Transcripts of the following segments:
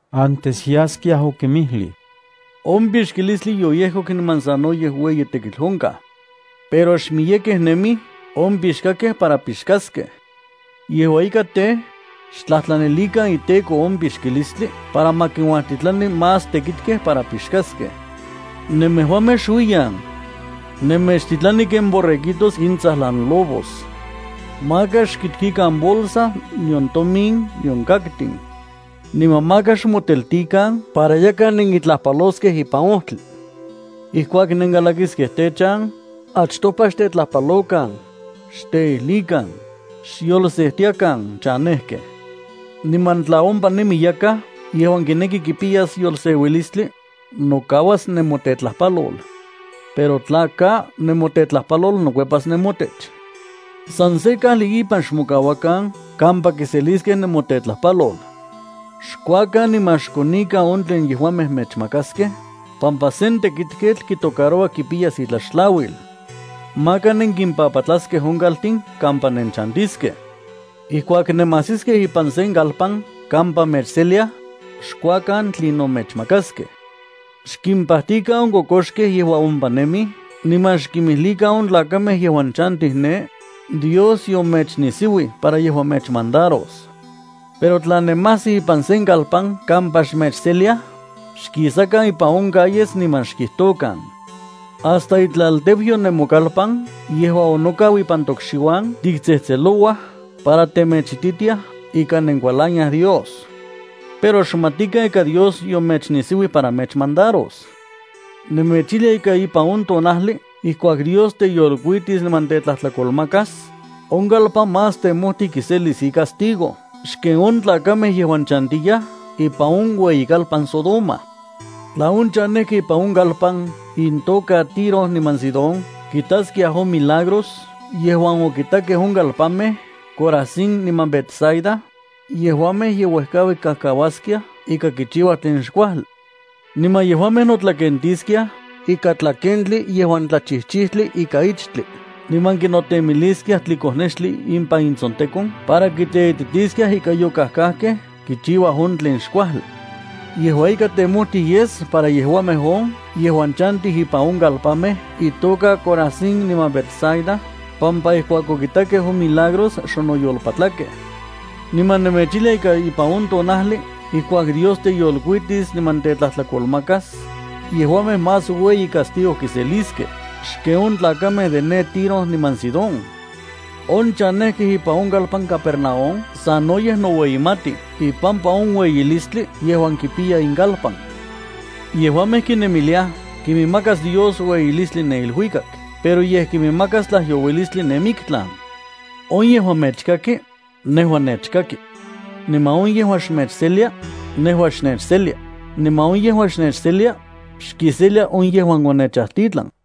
Antes yaskiaj okinmijlij: —On pixkilistli yoyekok niman sanoyej ueyi tekitl onkaj. Pero xmiyekej nemij on pixkakej para pixkaskej. Yejua ika tej, xtlajtlanilikan iTEKO on pixkilistli para ma kinuajtitlani más tekitkej para pixkaskej. Nemejuamej xuiyan. Nemechtitlani ken borreguitos intsajlan lobos. Maka xkiktikan bolsa, nion tomin, nion kaktin. Niman maka xmoteltikan para yakaj nenkitlajpaloskej ipan ojtli. Ijkuak nenkalakiskej techan, achtopa xtetlajpalokan, xteijlikan: “¡Xyolsejtiakan chanejkej!” Niman tla ompa nemi yakaj yejuan kineki kipiyas yolseuilistli, nokauas nemotetlajpalol. Pero tla ka, nemotetlajpalol nokuepas nemotech. San se kajli ipan xmokauakan kampa kiseliskej nemotetlajpalol. Xkuakan niman xkonikan on tlen yejuamej mechmakaskej, pampa sen tekitketl kitocaroua kipiyas itlaxtlauil. Maka nenkimpapatlaskej on chaltin kampa nenchantiskej. Ijkuak nemajsiskej ipan sen kalpan kampa mechseliaj, xkuakan tlinon mechmakaskej. Xkimpajtikan on kokoxkej yejuan ompa nemij niman xkimijlikan on tlakamej yejuan chantij ne: “Dios yomechnisiuij para yejua mechmandaros.” Pero tla nemajsij ipan se kalpan kampa xmechseliaj, xkisakan ipan on calles niman xkijtokan: “Hasta itlalteuyo nemokalpan yejuan onokau ipan tokxiuan tiktsejtselouaj para temechititiaj ika nenkualaniaj Dios. Pero xmatikan ika Dios yomechnisiuij para mechmandaros.” Nemechijlia ika ipan on tonajli ijkuak Dios teyolkuitis niman tetlajtlakolmakas, on kalpan más temojtij kiselis icastigo xken on tlakamej yejuan chantiyaj ipan on ueyikalpan Sodoma. ’Tla on chanejkej ipan on kalpan intoka Tiro niman Sidón kitaskiaj on milagros yejuan okitakej on kalpanmej Corazín niman Betsaida, yejuamej ye uejkaui kajkauaskiaj ika kichiuaj tlen xkuajli. Niman yejuamej notlakentiskiaj ikan tlakentli yejuan tlachijchijtli ikan ichtli niman kinotemiliskiaj tlikonextli ipan intsontekon para kiteititiskiaj ika yokajkajkej kichiuaj on tlen xkuajli. Yejua ika temojtij yes para yejuamej on yejuan chantij ipan on kalpanmej itoka Corazín niman Betsaida pampa ijkuak okitakej on milagros xonoyolpatlakej. Niman nemechijlia ika ipan on tonajli ijkuak Dios teyolkuitis niman tetlajtlakolmakas, yejuamej más ueyi castigo kiseliskej xken on tlakamej de ne Tiro niman Sidón. On chanejkej ipan on kalpan Capernaúm sanoyej noueyimatij ipampa on ueyilistli yejuan kipiya inkalpan. Yejuamej kinemiliaj kiminmakas Dios ueyilistli ne iluikak pero yej kiminmakas tlajyouilistli ne miktlan. ’On yejuan mechkaki, nejua nechkaki. Niman on yejuan xmechselia, nejua xnechselia, niman on yejuan xnechselia, xkiselia on yejuan onechajtitlan.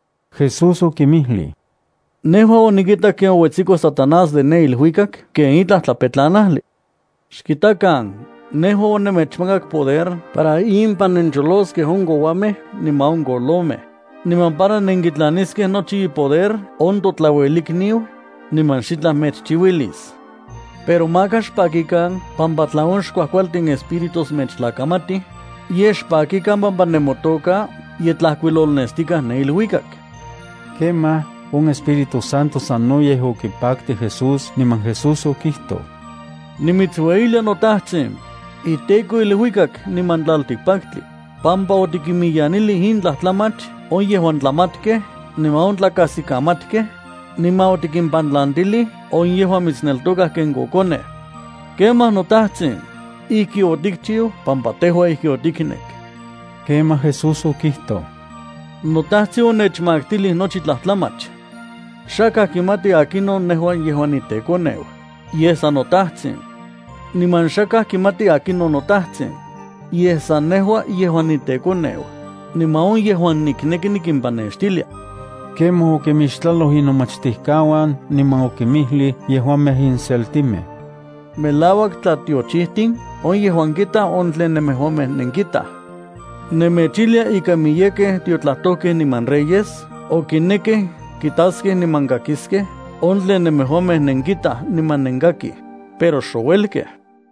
Jesús okinmijlij: —Nejua onikitak ken ouetsiko Satanás de ne iluikak ken itlaj tlapetlanajli. Xkitakan, nejua onenmechmakak poder para impan nencholoskej on kouamej niman on kolomej, niman para nenkitlaniskej nochi ipoder on totlauelikniu, niman xitlaj mechchiuilis. Pero maka xpakikan pampa tla on xkuajkualtin espíritus mechtlakamatij, yej xpakikan pampa nemotoka ye tlajkuilolnestikaj ne iluikak. Kemaj on Espíritu Santo sanoyej okipaktij Jesús niman Jesús okijtoj: —Nimitsueyilia noTajtsin, iTEKO iluikak niman tlaltikpaktli, pampa otikinmiyanilij in tlajtlamach on yejuan tlamatkej niman on tlakajsikamatkej, niman otikimpantlantilij on yejuan mitsneltokaj ken kokonej. Kemaj, noTajtsin, ijki otikchiu pampa tejua ijki otiknek. Kemaj Jesús okijtoj: —NoTajtsin onechmaktilij nochi tlajtlamach. Xakaj kimati akinon nejua yejuan niteKoneu, yej san noTajtsin. Niman xakaj kimati akinon noTajtsin, yej san nejua yejuan niteKoneu, niman on yejuan nikneki nikimpanextilia. Kemaj okimixtlaloj inomachtijkauan niman okinmijlij yejuamej inseltimej: —Melauak tlatiochijtin on yejuan kitaj on tlen nemejuamej nenkitaj. Nemechijlia ika miyekej tiotlajtojkej niman reyes okinekkej kitaskej niman kakiskej on tlen nemejuamej nenkitaj niman nenkakij, pero xouelkej.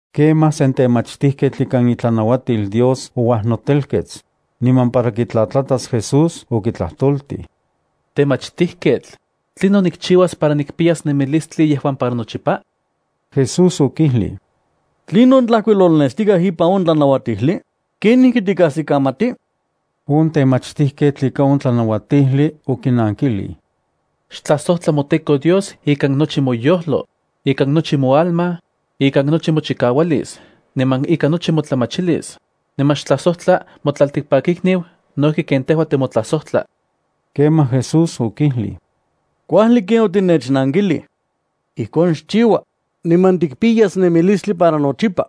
Kemaj sen temachtijketl ikan itlanauatil Dios ouajnotelkets, niman para kitlatlatas Jesús okitlajtoltij: —Temachtijketl, ¿tlinon nikchiuas para nikpiyas nemilistli yejuan para nochipa? Jesús okijlij: —¿Tlinon tlajkuilolnestikaj ipan on tlanauatijli? ¿Kenijki tikajsikamati? On temachtijketl ikan on tlanauatijli okinankilij: —Xtlajsojtla moTEKO Dios ikan nochi moyojlo, ikan nochi moalma, ikan nochi mochikaualis niman ikan nochi motlamachilis, niman xtlajsojtla motlaltikpakikniu no ijki ken tejua timotlajsojtla. Kemaj Jesús okijlij: —Kuajli ken otinechnankilij. Ijkon xchiua, niman tikpiyas nemilistli para nochipa.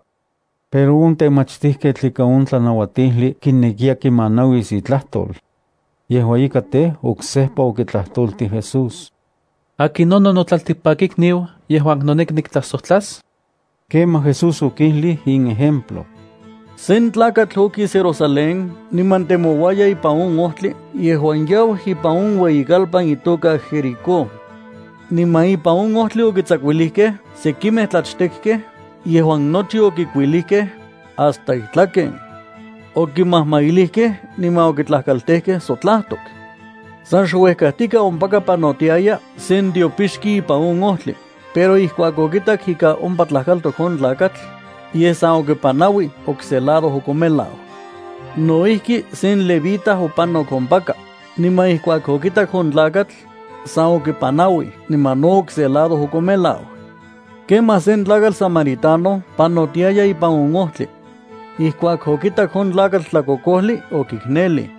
Pero on temachtijketl ikan on tlanauatijli kinekiya kimanauis itlajtol. Yejua ika tej, oksejpa okitlajtoltij Jesús: —¿Akinonon notlaltikpakikniu yejuan noneki niktlajsojtlas? Kemaj Jesús okijlij in ejemplo: —Sen tlakatl okis Jerusalén niman temouaya ipan on ojtli yejuan yau ipan on ueyikalpan itoka Jericó. Niman ipan on ojtli okitsakuilijkej sekimej tlachtekkej yejuan nochi okikuilijkej, hasta itlaken. Okimajmailijkej niman okitlajkaltejkej sotlajtok. San xuejkajtika ompaka panotiaya sen tiopixki ipan on ojtli, pero ijkuak okitak ika ompa tlajkaltok on tlakatl, yej san okipanauij okse lado okomelau. No ijki sen levita opanok ompaka, niman ijkuak okitak on tlakatl, san okipanauij niman no okse lado okomelau. Kemaj sen tlakatl samaritano panotiaya ipan on ojtli. Ijkuak okitak on tlakatl tlakokojli, okiknelij.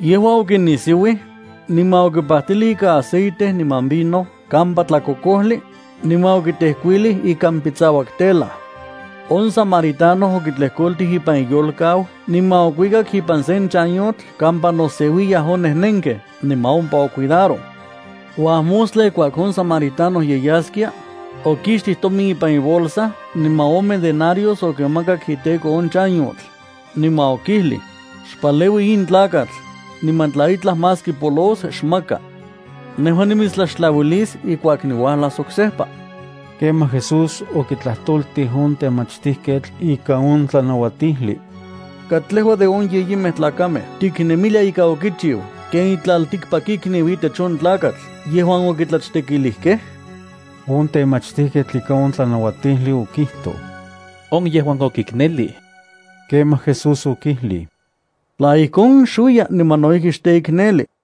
Yejua okinisiuij, niman okipajtilij ikan aceite niman vino kampa tlakokojli, niman okitejkuilij ikan pitsauak telaj. On samaritano okitlejkoltij ipan iyolkau niman okuikak ipan se chanyotl kampa noseuiyaj on nejnenkej niman ompa ocuidaroj. Uajmostla, ijkuak on samaritano ye yaskia, okixtij tomin ipan ibolsa niman ome denarios okimakak iteko on chanyotl, niman okijlij: “Xpaleui in tlakatl, niman tla itlaj más kipolos, xmaka. Nejua nimitstlaxtlauilis ijkuak niuajlas oksejpa.” Kemaj Jesús okitlajtoltij on temachtijketl ikan on tlanauatijli: —¿Katlejua de on yeyimej tlakamej tiknemilia ika okichiu ken itlaltikpakikniu itech on tlakatl yejuan okitlachtekilijkej? On temachtijketl ikan on tlanauatijli okijtoj: —On yejuan okiknelij. Kemaj Jesús okijlij: —Tla ijkon, xuiya niman no ijki xteikneli.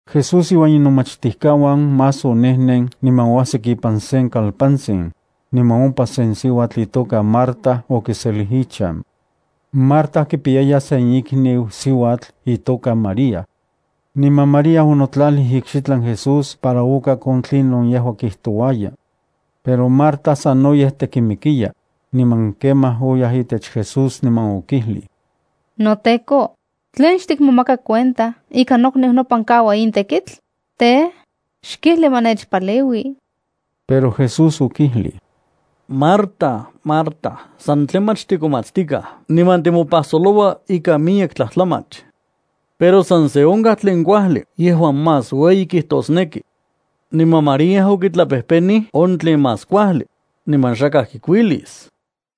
Jesús iuan inomachtijkauan más onejnen niman oajsik ipan sen kalpantsin, niman ompa sen siuatl itoka Marta okiselij ichan. Marta kipiyaya sen ikniu siuatl itoka María. Niman María onotlalij ikxitlan Jesús para okak on tlinon yejua kijtouaya. Pero Marta sanoyej tekimikiya, niman kemaj oyaj itech Jesús niman okijlij: —NoTEKO, ¿tlen xtikmomaka cuenta ika nokniu nopan kaua in tekitl? Tej, xkijli ma nechpaleui. Pero Jesús okijlij: —Marta, Marta, sa tlamach tikomatstikaj niman timopajsoloua ikan miyek tlajtlamach. Pero san se onkaj tlen kuajli yejuan más ueyi kijtosneki. Niman María okitlapejpenij on tlen más kuajli, niman xakaj kikuilis.